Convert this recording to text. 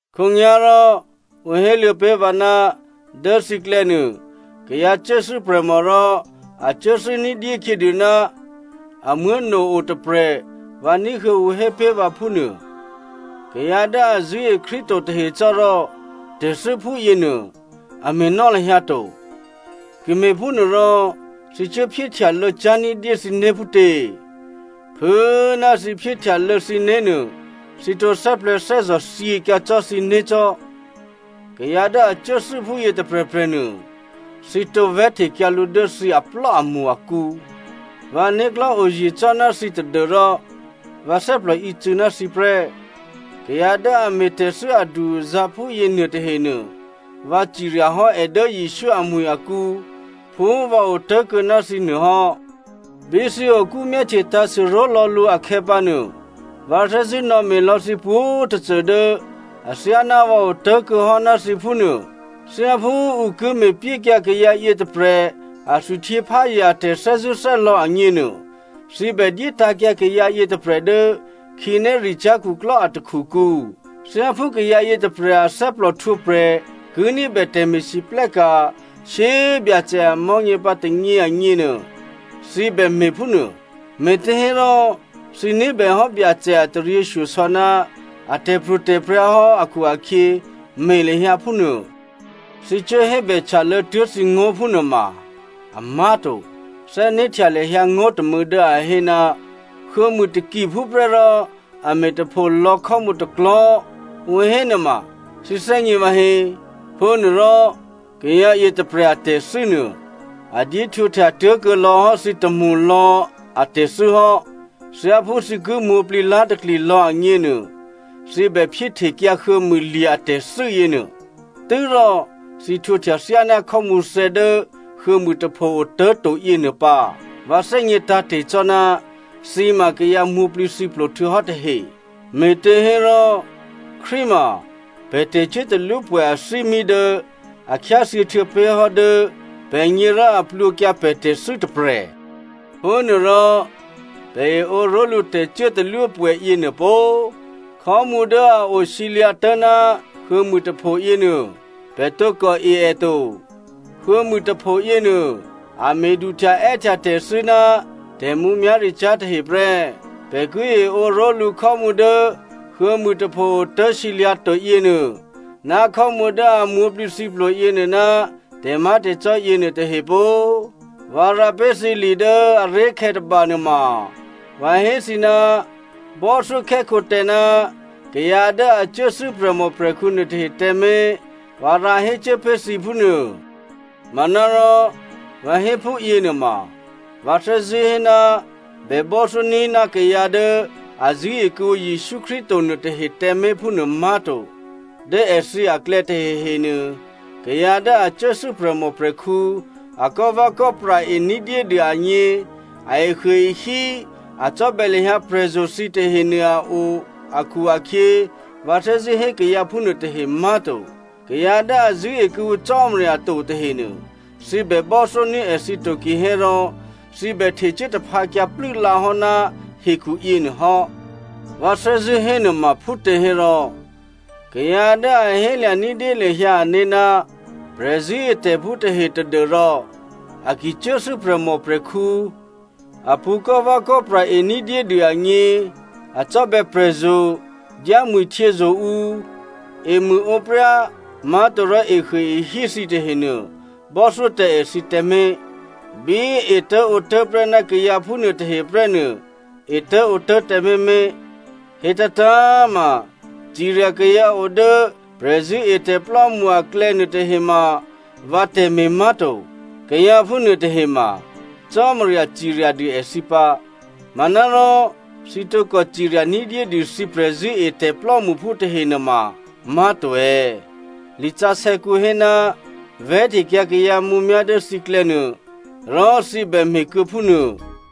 Khǒnyá̤rò, ǔ héluô̌ pé̤ vǎ, dố thǐklè̌ nuô kayǎ cuốthû́ prè̤mò rò a cuốthû́ ní̤dyé khyědû ná amuố̤no o tôprè̤ vǎ ní̤huô̌ ǔ hé pé̤ vǎ phúnuô. Kayǎ dố a zṳ̂́e Krístu to tahe cò́ rò tè̤thû́ phúyěnuô a me̤nò́ lahyǎ to. Ki me̤phúnuôrò, thǐ cuố phyéhtyalô̌cyá̤ ní̤dyé thǐné̤ phútě? Phû꤮ ná thǐ phyéhtyalô̌ thǐné̤ nuô, thǐ tǒ thè́plè̤̌thè́zò̤ thyěkyǎ cò́ thǐné̤ cò́. Kayǎ dố a cuốthû́ phúyě tôprè̤prè̤ nuô, thǐ tǒ vè̤́htekyǎ lǔ dố thǐ aplò́amṳ akǔ. Vǎ né̤klò̤́ oye̤ cò́ ná thǐ tadû́rò vǎ thè́plò ícû̌ ná thǐ prè́. Kayǎ dố a me̤tè̤thû́ adu-azǎ̤ phúyě nuôtahenuô, vǎ cirya hò́ è dố Jesǔ amwi̤ akǔ phú vǎ otố̤kuô̌ ná thǐ nuô hò́. Bí thǐ okú myáhtye tǎ̤sû ró̤lò̌ lǔ akhè̌pǎnuô, vǎ thè́zṳ̂́ nò̌me̤ lò̌ thǐ pwǒ̤꤮ tôcô dố athyáná vǎ otố̤kuô̌ hò́ ná thǐ phúnuô. Thyáphú ǔ ki me̤pyékyǎ kayǎ yětôprè̤ a thwihtyěpházye a tè̤thè́zṳ̂́thè́lò̌ agněnuô, thǐ bè dyétǎ̤kyǎ kayǎ yětôprè̤ dố khǐnéricyá̤ khuklò́ a takhukǔ. Thyáphú kayǎ yětôprè̤ a thè́plòhtwǒprè̤ ki ní̤bè tè̤me̤lwóhteka̤ shyé꤮ Byacè a mò̤́nyě pǎ tônyě agněnuô, thǐ bè me̤ phúnuô. Me̤těhérò thǐ ní̤bèhò́ Byacè a taryěshyosò̌ ná a tè̤pro̤tè̤prya̤ hò́ akhu-akhyě me̤ lahyǎ phúnuô. Thǐ cuố hébè htyalô̌ tuố̤ thǐngó̤ phúnuôma amá̤ to. Thè́né̤htya lahyǎ ngó̤ tômû̌ dố a hé, “Huô̌mû takiphú prè́ rò a me̤tapho lò̌ khò́mǔ tôklò̤́,” ǔ hé nuôma thǐ thè́gně vǎhé. Phúnuôrò kayǎ yětôprè̤ a tè̤thû́nuô, a dyéhtwǒhtya tuố̤kuô̌ lò̌ hò́ thǐ tômṳlò̌ atè̤thû́ hò́. Thyáphú thǐ ki mwǒ̤plǐ lá̤takli lò̌ agněnuô, thǐ bè phyéhtekyǎ huô̌mû lye̤ atè̤thû́ yěnuô, tû́rò thǐ htwǒhtya thyáná khò́mǔ thè̌ dố huô̌mûtapho otố̤to yěnuô pǎ. Vǎ thè́gně tǎ̤te̤ cò́ ná thǐ ma kayǎ mwǒ̤plǐthǐplo htuô̌hò́ tahe, me̤těhérò Krístu ma pè̤ tè̤cuốtalwópwè̌ athímí dố a khyáthyě htuô̌ pé̤ hò́ dố pè̤gně rò a plwǒkyǎ pè̤ tè̤thû́ tôprè̤. Phúnuôrò pè̤ eǒ ró̤lǔ tè̤cuốtalwópwè̌ yěnuô pó꤮. Khò́mǔ dố a osǐlyǎ̤ tố̤ ná huô̌mûtapho yěnuô, pè̤ tǒkò e è to. Huô̌mûtapho yěnuô, a me̤ duhtya è́htya tè̤thû́ ná tè̤mǔmyá̤ricyá̤ tahe prè́. Pè̤ ki eǒ ró̤lǔ khò́mǔ dố huô̌mûtapho otố̤sǐlyǎ̤ to yěnuô, ná khò́mǔ dố a mwǒ̤plǐthǐplo yěnuô ná tè̤má̤tè̤cò́ yěnuô tahe pó꤮! Vǎ rǎ pé̤ thǐ li dố aré̤khè̌ tôba nuôma, vǎ hé thǐ ná bò́thyókhè́khǒ tǎ ná kayǎ dố a cuốthû́ prè̤mòprè̤khǔ nuôtahe tǎmé̤, vǎ rǎ hécuố pé̤ thǐ phúnuô. Manárò vǎ hé phúyě nuôma, vǎ thè́zṳ̂́ hé ná bè bò́thyóní̤ ná kayǎ dố a zṳ̂́e kuô̌ǔ Jesǔ Krístu to nuôtahe tǎmé̤ phúnuô má̤to. Dố èthǐ aklè̌ tahehenuô kayǎ dố a cuốthû́ prè̤mòprè̤khǔ, a kò́vè̌kò́pra e ní̤dyédû agně, a ehuôehí, a cò́bè̌ lahyǎ prè̤zo̤ thǐ tahenuô a o akhu-akhyě vǎ thè́zṳ̂́ hé kayǎ phúnuô tahe má̤to. Kayǎ dố a zṳ̂́e kuô̌ǔ Cò́marya to tahenuô thǐ bè bò́thyóní̤ èthǐ to kihérò, thǐ bè htecuố taphǎkyǎ plû́lǎ hò́ ná hekhu yěnuô hò́. Vǎ thè́zṳ̂́ hénuôma phútěhérò kayǎ dố a hélya̤ ní̤dyé lahyǎ ané̤ ná prè̤zṳ̂́etè̤phú tahe tadû́rò a ki cuốthû́ prè̤mòprè̤khǔ, a pṳ̌ kò́vè̌kò́pra ení̤dyédû agně, a cò́bè̌ prè̤zo̤, dyámwi̤htyězo̤ ǔ, emṳ̂ǒpryá má̤torò ehuôehí thǐ tahenuô bò́thyó tǎ èthǐ tǎmé̤. Bí etố̤ǒtố̤ prè́ ná kayǎ phúnuô tahe prè́ nuô etố̤ǒtố̤ tǎmé̤ mé̤. Hétǎ̤tǎ̤꤮ ma, cirya kayǎ o dố prè̤zṳ̂́etè̤plò́mṳ aklò̌ nuôtahe ma vǎ tè̤me̤ má̤to. Kayǎ phúnuô tahe ma Cò́marya cirya dû èthǐ pǎ. Manárò thǐ tǒkò cirya ní̤dyédû thǐ prè̤zṳ̂́etè̤ plò́mṳphú tahe nuôma má̤to è̌? Lisǎsè̌kǔ hé, “Vè̤́htekyǎ kayǎ mǔmyá̤ dố thǐklè̌ nuô,” rò thǐ bè me̤ kuô̌ phúnuô.